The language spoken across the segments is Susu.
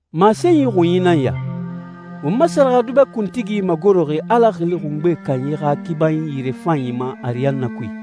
Masenyi xunyi nan ya: Won ma sɛrɛxɛdubɛ kuntigi magoroxi Ala Xili Xungbe Kanyi xa kibanyi yirefanyi ma ariyanna kui.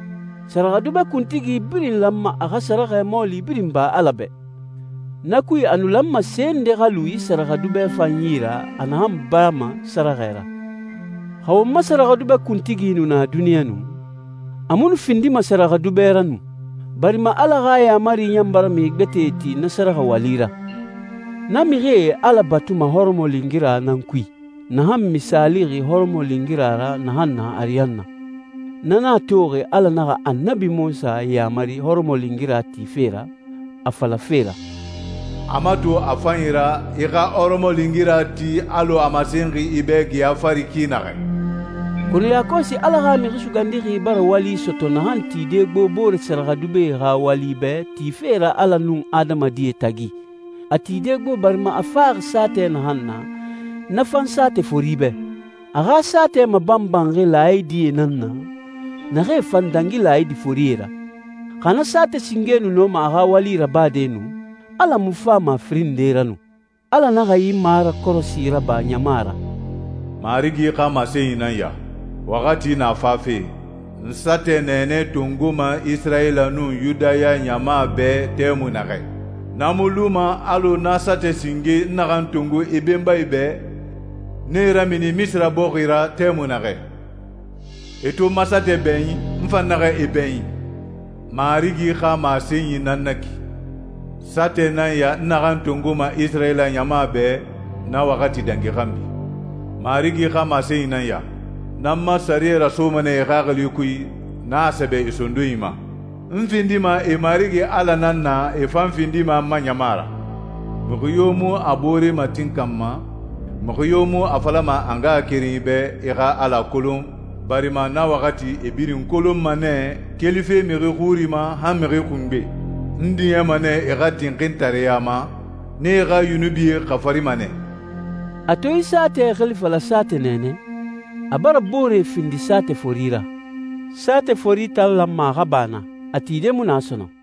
Sɛrɛxɛdubɛ kuntigi birin lanma a xa sɛrɛxɛ mɔɔli birin ba Ala bɛ. Na kui a nu lanma se nde xa lu yi sɛrɛxɛdubɛ fan yi ra a naxan bama sɛrɛxɛ ra. Xa won ma sɛrɛxɛdubɛ kuntigi nu na duniɲa nu, a mu nu findima sɛrɛxɛdubɛ ra nu, barima Ala xa yaamari ɲan bara mixi gbɛtɛe ti na sɛrɛxɛ wali ra. Na mixie Ala batuma hɔrɔmɔlingira nan kui, naxan misaalixi hɔrɔmɔlingira ra naxan na ariyanna. Na nan a toxi Ala naxa Annabi Munsa yamari hɔrɔmɔlingira tife ra, a falafe ra, «A mato a fanyi ra, i xa hɔrɔmɔlingira ti alɔ a masenxi i bɛ geya fari ki naxɛ.» Kɔnɔ yakɔsi Ala xa Mixi Sugandixi bara wali sɔtɔ naxan tide gbo boore sɛrɛxɛdubɛe xa wali bɛ tife ra Ala nun adamadie tagi. A tide gbo barima a faxi saatɛ naxan na, na fan saatɛ fori bɛ. A xa saatɛ mabanbanxi laayidie nan na, naxee fan dangi laayidi forie ra. Xa na saatɛ singe nu nɔma a xa wali rabade nu, Ala mu fama a firin nde ra nu. Ala naxa yi marakɔrɔsi raba ɲama ra, «Marigi xa masenyi nan ya: Waxati na fafe, n saatɛ nɛɛnɛ tongoma Isirayila nun Yudaya ɲama bɛ tɛmui naxɛ. Na mu luma alɔ na saatɛ singe n naxan tongo e benbae bɛ, n e ramini Misira bɔxi ra tɛmui naxɛ. E to n ma saatɛ bɛɲin, n fan naxa e bɛɲin. Marigi xa masenyi nan na ki. Saatɛ nan ya n naxan tongoma Isirayila ɲama bɛ, na waxati dangi xanbi. Marigi xa masenyi nan ya: N nan n ma sɛriyɛ rasoma nɛ e xaxili kui, n a sɛbɛ e sondonyi ma. N findima e Marigi Ala nan na, e fan findi n ma ɲama ra. Mixi yo mu a boore matinkanma, mixi yo mu a falama a ngaxakerenyi bɛ, ‹I xa Ala kolon,› barima na waxati e birin n kolonma nɛ, kelife mixi xuri ma han mixi xungbe. N diɲɛma nɛ e xa tinxintareya ma, n e xa yunubie xafarima nɛ.» A to yi saatɛ xili fala saatɛ nɛɛnɛ, a bara boore findi saatɛ fori ra. Saatɛ fori tan lanma a xa ba na, a tide mu na sɔnɔn.